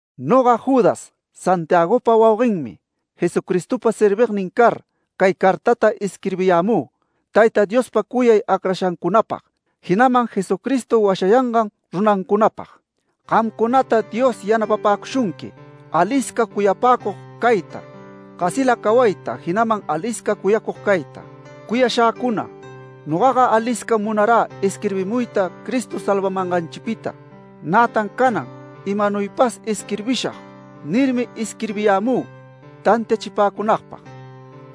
Noga Judas Santiagopa wauguenmi, Jesucristopa servignin car, cay cartata isquirbiyämü, Tayta Diospa cuyay acrashancunapag, jinaman Jesucristo washayangan runancunapag. Gamcunata Dios yanapapäcushunqui, alisca cuyapäcug cayta, gasila cawayta, jinaman alisca cuyacug cayta. Cuyashäcuna, nogaga aliscam munarä isquirbimuyta Cristo salvamanganchipita. Nätan canan “Imanuypas isquirbishag” nirmi isquirbiyämü tantiachipäcunagpag.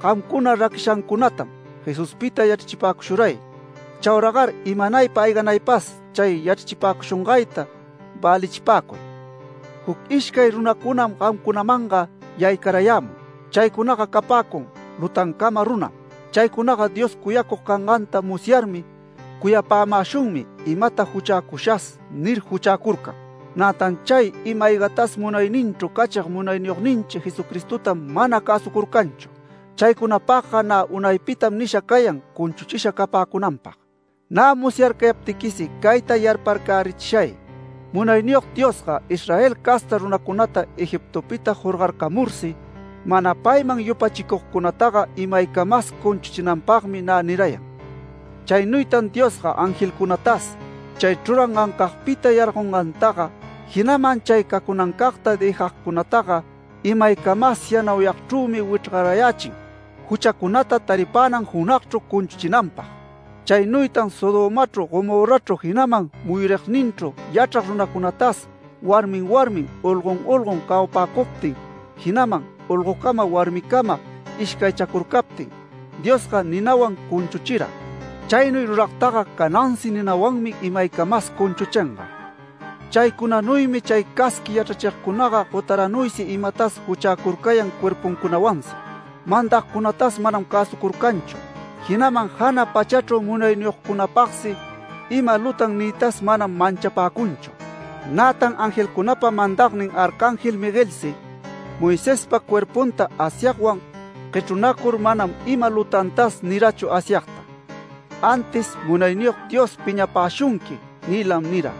Gamcuna raquishancunatam Jesuspita yachrachipäcushuray. Chauragar imanaypa ayganaypas chay yachrachipäcushungayta välichipacuy. Juc ishcay runacunam gamcunamanga yaycarayämun. Chaycunaga capäcun lutancama runam. Chaycunaga Dios cuyacug canganta musyarmi, “Cuyapämäshunmi imata juchäcushas” nir juchäcurcan. Nätan chay ima-aygatas munayninchru cachig Munayniyogninchi Jesucristotam mana cäsucurcanchu. Chaycunapagga nä unaypitam nisha cayan cunchuchisha capäcunanpag. Nä musyarcayaptiquisi cayta yarparcärichishay, Munayniyog Diosga Israel casta runancunata Egiptopita jorgarcamursi, mana payman yupachicugcunataga imaycamas cunchuchinanpagmi nä nirayan. Chaynuytan Diosga angelcunatas chay chrurangancagpita yargogcunataga, jinaman chay cacunancagta dëjagcunataga, imaycamas yanauyagchrümi wichrgarayächin, juchacunata taripänan junagchru cunchuchinanpag. Chaynuytan Sodomachru Gomorrachru, jinaman muyurigninchru yachrag runacunatas, warmin warmin, olgon olgon cawapäcuptin, jinaman olgocama, warmicama ishcaychacurcaptin, Diosga ninawan cunchuchira. Chaynuy ruragtaga canasi ninawanmi imaycamas cunchuchinga. Chaycunanuymi chay casqui yachrachigcunaga gotaranuysi imatas juchäcurcayan cuerpuncunawansi. Mandagcunatas manam cäsucurcanchu, jinaman jana pachachru munayniyogcunapagsi ima lutan niytas manam manchapäcunchu. Nätan angelcunapa mandagnin arcángel Miguelsi Moisespa cuerpunta Asyagwan guechrunacur manam ima lutantas nirachu Asyagta. Antis “Munayniyog Dios piñapäshunqui” niylam nira.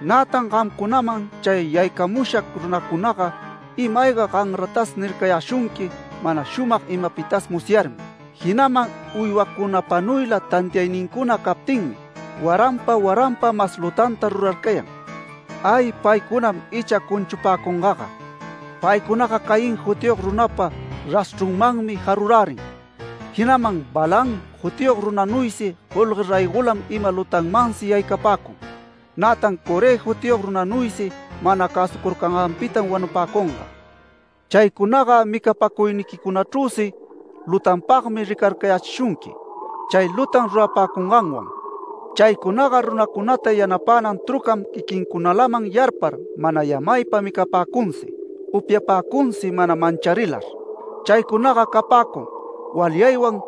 Nätan gamcunaman chay yaycamusha runacunaga ima-ayga ganratas nircayäshunqui mana shumag imapitas musyarmi. Jinaman uywacunapanuyla tantiaynincuna captinmi, waranpa waranpa mas lutanta ruracurcayan. ¡Ay paycunam icha cunchupäcungaga! Paycunaga Caín jutiyog runapa rashchrunmanmi jarurärin. Jinaman Balaam jutiyog runanuysi golgue raygolam ima lutanmansi yaycapäcun, nätan Coré jutiyog runanuysi mana cäsucurcanganpitam wanupäcunga. Chaycunaga micapäcuyniquicunachrüsi lutanpagmi ricarcayächishunqui chay lutan rurapäcunganwan. Chaycunaga runacunata yanapänan trucam quiquincunalaman yarpar mana yamaypa, micapäcunsi, upyapäcunsi mana mancharilar. Chaycunaga capäcun walyaywan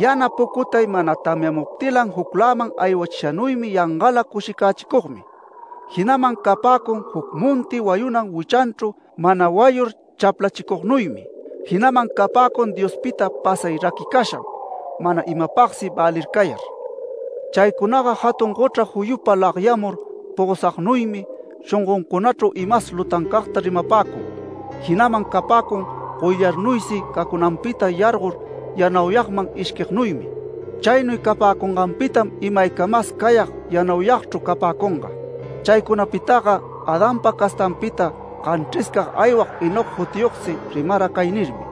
yana pucutay mana tamyamuptilan jucläman aywachishanuy yangala cushicachicugmi. Jinaman capäcun juc monti wayunan wichanchru mana wayur chaplachicugnuymi. Jinaman capäcun Diospita pasay raquicasham, mana imapagsi välircayar. Chaycunaga jatun gochra juyupa lagyamur pogosagnuymi, shongoncunachru imas lutancagta rimapäcun, jinaman capäcun goyllarnuysi cacunanpita yargor yanauyagman ishquignuymi. Chaynuy capäcunganpitam imaycamas cayag yanauyagchru capäcunga. Chaycunapitaga Adanpa castanpita ganchriscag aywag Enoc jutiyogsi rimara cay nirmi: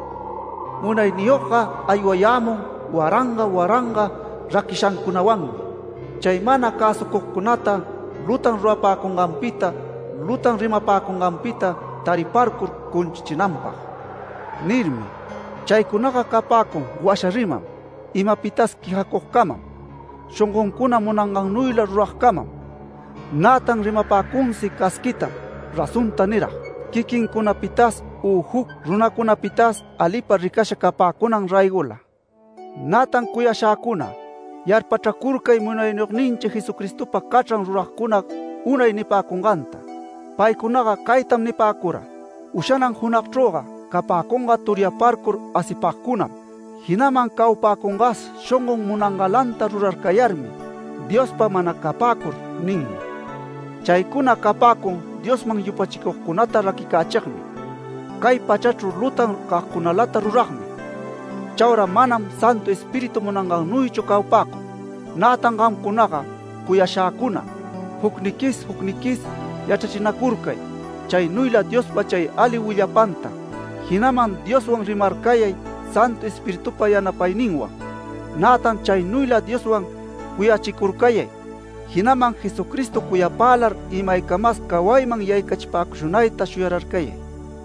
“Munayniyogga aywayämun waranga waranga raquishancunawanmi, chay mana cäsucugcunata, lutan rurapäcunganpita, lutan rimapäcunganpita, tariparcur cunchuchinanpag” nirmi. Chaycunaga capäcun washa riman, imapitas quejacugcamam, shongoncuna munangannuyla ruragcamam, nätan rimapäcunsi casquitam razonta nirag, quiquincunapitas u juc runacunapitas alipa ricasha capäcunan raygola. Nätan cuyashäcuna, yarpachracurcay Munayniyogninchi Jesucristopa cachran ruragcuna unay nipäcunganta. Paycunaga caytam nipäcura: “Ushanan junagchrüga capäcunga turyaparcur asipagcunam, jinaman cawapäcungas shongon munangalanta rurarcayarmi, Diospa mana capäcur” ninmi. Chaycuna capäcun Diosman yupachicugcunata raquicächigmi, cay pachachru lutan cagcunalata ruragmi. Chaura manam Santu Espíritu munangannuychu cawapäcun. Nätan gamcunaga cuyashäcuna, jucniquis jucniquis yachrachinacurcay chaynuyla Diospa chay ali willapanta, jinaman Dioswan rimarcayay Santu Espiritupa yanapayninwan. Nätan chaynuyla Dioswan cuyachicurcayay, jinaman Jesucristo cuyapälar imaycamas cawayman yaycachipäcushunayta shuyararcayay.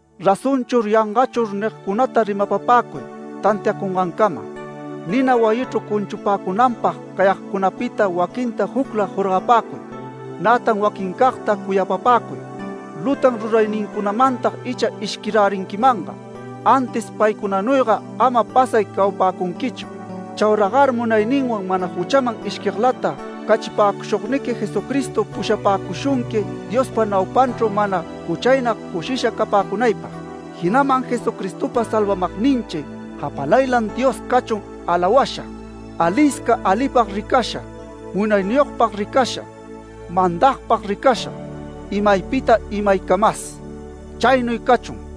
“Razonchur yangachur” nigcunata rimapapäcuy tantiacungancama. Nina wayichru cunchupäcunanpag cayagcunapita waquinta jucla jorgapäcuy. Nätan waquincagta cuyapapäcuy, lutan ruraynincunamantag icha ishquirärinquimanga, antis paycunanuyga ama pasay cawapäcunquichu. Chauragar munayninwan mana juchaman ishquiglata cachipäcushugniqui Jesucristo pushapäcushunqui Diospa naupanchru mana juchaynag cushisha capäcunaypag. Jinaman Jesucristopa salvamagninchi japalaylan Dios cachun alawasha, alisca alipag ricasha, munayniyogpag ricasha, mandagpag ricasha, imaypita imaycamas. Chaynuy cachun.